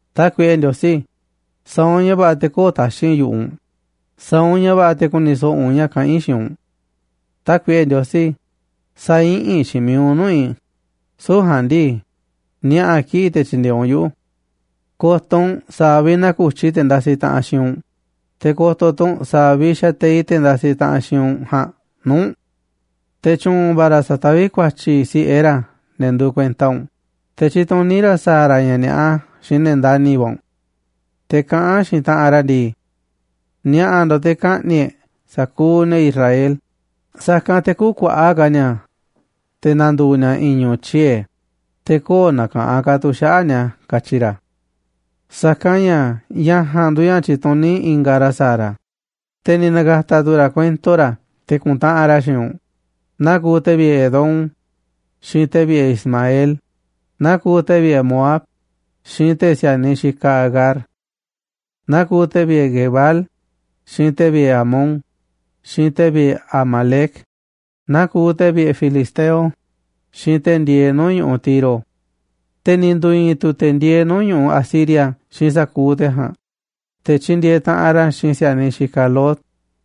Tákuiꞌe Ndiosí, sa̱a̱ u̱nꞌ ña̱ va̱ꞌa̱ te̱ kö̱o̱ taxi̱nꞌ yu̱ꞌuꞌ u̱nꞌ, sa̱a̱ u̱nꞌ ña̱ va̱ꞌa̱ te̱ ku̱ni̱ so̱ꞌo̱ u̱nꞌ ña̱ kaꞌán i̱ xiinꞌ u̱nꞌ. Tákuiꞌe Ndiosí, sä̱a̱ iꞌinꞌ xiinꞌ mi̱iꞌ u̱nꞌ nuu̱ꞌ i̱, süu̱ꞌ ja̱a̱nꞌ ndii, ni̱a̱ꞌa̱ kiꞌi̱ꞌ te̱ tyi̱ndi̱e̱eꞌ u̱nꞌ yuꞌu̱. Ko̱to̱ u̱nꞌ sa̱a̱ vi̱ꞌ naku̱tyi te̱ ndasiꞌ taꞌanꞌ xiinꞌ u̱nꞌ, te̱ ko̱to̱ tu̱ u̱nꞌ sa̱a̱ vi̱ꞌ xateiꞌ te̱ ndasiꞌ taꞌanꞌ xiinꞌ u̱nꞌ ja̱a̱nꞌ nuu̱ꞌ u̱nꞌ. Te̱ tyu̱u̱n va̱ ra̱ sataví ku̱a̱tyi̱ si̱ꞌe ra̱ ne̱ nduuꞌ kuenta u̱nꞌ, te̱ tyituní ra̱ sa̱a̱ ra̱ ña̱ ni̱a̱ꞌa xiinꞌ ne̱ ndani̱ va̱ u̱nꞌ. Te̱ kaꞌán xiinꞌ taꞌanꞌ ra̱ ndii: “Ni̱a̱ꞌa̱ ndo̱ꞌ te̱ ka̱ꞌni̱ꞌ e̱ꞌ sa̱kuuꞌ ne̱ Israel, sa̱kanꞌ te̱ kü̱kuaꞌa̱ꞌ ka̱ ni̱a̱ te̱ na̱ndu̱u̱ ni̱a̱ i̱i̱n ñu̱u̱ tyiee̱, te̱ köo̱ꞌ na̱ka̱ꞌanꞌ ka̱ tu̱ xaꞌa̱ꞌ ni̱a̱”, katyi ra̱. Sa̱kanꞌ ña̱ ña̱ ja̱a̱nꞌ nduuꞌ ña̱ ni̱ tyi̱tuní ingaꞌ ra̱ sa̱a̱ ra̱, te̱ ni̱ na̱ka̱ta̱ tu̱ ra̱ kuento ra̱ te̱ ku̱ntaꞌanꞌ ra̱ xiinꞌ u̱nꞌ, naa kuuꞌ te̱ vi̱ꞌe̱ Edom xiinꞌ te̱ vi̱ꞌe̱ Ismael, naa kuuꞌ te̱ vi̱ꞌe̱ Moab xiinꞌ te̱ si̱a̱niꞌ xikaꞌ Agar. Naa kuuꞌ te̱ vi̱ꞌe̱ Gebal, xiinꞌ te̱ vi̱ꞌe̱ Amón, xiinꞌ te̱ vi̱ꞌe̱ Amalec, naa kuuꞌ te̱ vi̱ꞌe̱ Filisteo, xiinꞌ te̱ ndieeꞌ nuu̱ꞌ ñu̱ꞌuꞌ Tiro. Te̱ ni̱ ndu̱i̱i̱n tu̱ te̱ ndieeꞌ nuu̱ꞌ ñu̱ꞌuꞌ Asiria xiinꞌ sa̱kuuꞌ te̱ ja̱a̱nꞌ, te̱ tyindieeꞌ taꞌanꞌ ra̱ xiinꞌ si̱a̱niꞌ xikaꞌ Lot.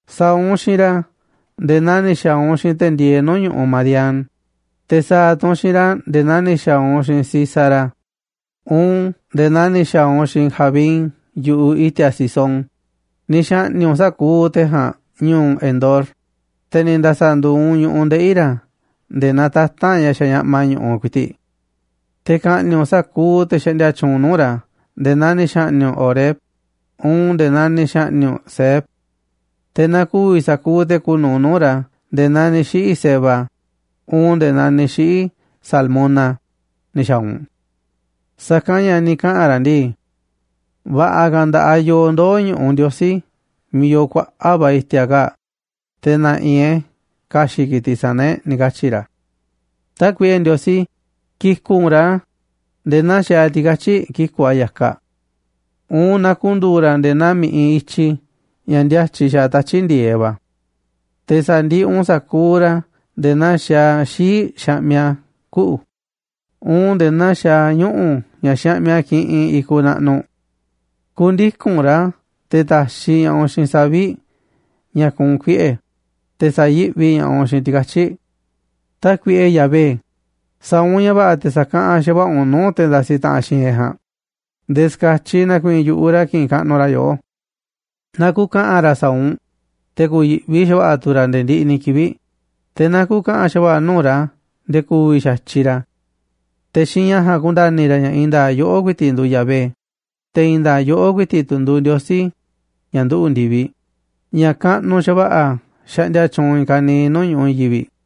Sa̱a̱ u̱nꞌ xiinꞌ ra̱ nde̱e̱ naa ni̱ xa̱a̱ u̱nꞌ xiinꞌ te̱ ndieeꞌ nuu̱ꞌ ñu̱ꞌuꞌ Madián, te̱ sa̱a̱ tu̱ u̱nꞌ xiinꞌ ra̱ nde̱e̱ naa ni̱ xa̱a̱ u̱nꞌ xiinꞌ Sísara, uun nde̱e̱ naa ni̱ xa̱a̱ u̱nꞌ xiinꞌ Jabín yu̱ꞌuꞌ i̱ti̱a̱ Cisón. Ni̱ xa̱ꞌni̱ꞌ u̱nꞌ sa̱kuuꞌ te̱ ja̱a̱nꞌ ñu̱u̱ Endor, te̱ ni̱ nda̱sa̱ nduuꞌ u̱nꞌ ñu̱ꞌuꞌ ndeꞌi̱ ra̱ nde̱e̱ naa tata̱nꞌ ña̱ xañaꞌma ñu̱ꞌuꞌ ku̱i̱ti̱ꞌ. Te̱ ka̱ꞌni̱ꞌ u̱nꞌ sa̱kuuꞌ te̱ xaꞌndia tyuunꞌ nuu̱ꞌ ra̱ nde̱e̱ naa ni̱ xa̱ꞌni̱ꞌ u̱nꞌ Oreb uun nde̱e̱ naa ni̱ xa̱ꞌni̱ꞌ u̱nꞌ Zeeb. Te̱ na ku̱vi̱ sa̱kuuꞌ te̱ kuuꞌ nu̱uꞌ nuu̱ꞌ ra̱ nde̱e̱ naa ni̱ xiꞌi̱ Zeba uun nde̱e̱ naa ni̱ xiꞌi̱ Zalmuna ni̱ xa̱a̱ u̱nꞌ. Sa̱kanꞌ ña̱ ni̱ kaꞌa̱n ra̱ ndii: “Va̱ꞌa̱ ka̱ nda̱ꞌaꞌ yooꞌ ndoo̱ ñu̱ꞌuꞌ Ndiosí miiꞌ yoo kuaꞌa̱ꞌ va̱ i̱ti̱a̱ kaa̱ꞌ, te̱ na̱ꞌi̱ e̱ꞌ e̱ ka̱xi̱ꞌ ki̱tiꞌ sana̱ e̱ꞌ”, ni̱ katyi̱ ra̱. Tákuiꞌe Ndiosí, ki̱ku̱ꞌ u̱nꞌ ra̱ nde̱e̱ naa xaaꞌ ti̱katyi̱ꞌ kiku̱ꞌ a̱ ya̱kaꞌ, uun naa ku̱ndu̱u̱ ra̱ nde̱e̱ naa mi̱ꞌiꞌ i̱tyi ña̱ ndíátyiꞌ xaaꞌ tatyi̱ꞌ ndi̱e̱eꞌ va̱. Te̱ sa̱ndiꞌiꞌ u̱nꞌ sa̱kuuꞌ ra̱ nde̱e̱ naa xaaꞌ xii̱ꞌ xaꞌmiꞌ a̱ kuꞌu̱, uun nde̱e̱ naa xaaꞌ ñuꞌu̱ ña̱ xaꞌmiꞌ a̱ kiꞌinꞌ i̱kuꞌ naꞌnuꞌ. Ku̱ndiku̱n u̱nꞌ ra̱ te̱ ta̱xiꞌ ña̱ꞌaꞌ u̱nꞌ xiinꞌ savi̱ꞌ ña̱ kuunꞌ kuiꞌe̱, te̱ sa̱yi̱ꞌvi ña̱ꞌaꞌ u̱nꞌ xiinꞌ ti̱katyi̱ꞌ. Tákuiꞌe Yahvé, sa̱a̱ u̱nꞌ ña̱ va̱ꞌa̱ te̱ sa̱kaꞌanꞌ xa̱va̱ꞌa̱ u̱nꞌ nuu̱ꞌ te̱ ndasiꞌ taꞌanꞌ xiinꞌ e̱ꞌ ja̱a̱nꞌ, nde̱e̱ ska̱tyiꞌ na̱ku̱i̱i̱n yu̱ꞌuꞌ ra̱ ki̱ꞌi̱n kaꞌnuꞌ ra̱ yoꞌó. Na ku̱ka̱ꞌa̱n ra̱ sa̱a̱ u̱nꞌ, te̱ ku̱yi̱ꞌvi xa̱va̱ꞌa̱ tu̱ ra̱ nde̱e̱ ndiꞌiꞌ ni̱ kivi̱ꞌ, te̱ na ku̱ka̱ꞌa̱n xa̱va̱ꞌa̱ nuu̱ꞌ ra̱ nde̱e̱ ku̱vi̱ xa̱tyiꞌ ra̱. Te̱ xiinꞌ ña̱ ja̱a̱nꞌ ku̱nda̱ni̱ ra̱ ña̱ i̱i̱n nda̱a̱ꞌ yoꞌó ku̱i̱ti̱ꞌ nduuꞌ Yahvé, te̱ i̱i̱n nda̱a̱ꞌ yoꞌó ku̱i̱ti̱ꞌ tu̱ nduuꞌ Ndiosí, ña̱ nduꞌu̱ꞌ ndi̱viꞌ, ña̱ kaꞌnuꞌ xa̱va̱ꞌa̱ xaꞌndia tyuunꞌ i̱i̱n ka̱niiꞌ nuu̱ꞌ ñu̱ꞌuꞌ i̱i̱n yivi̱ꞌ.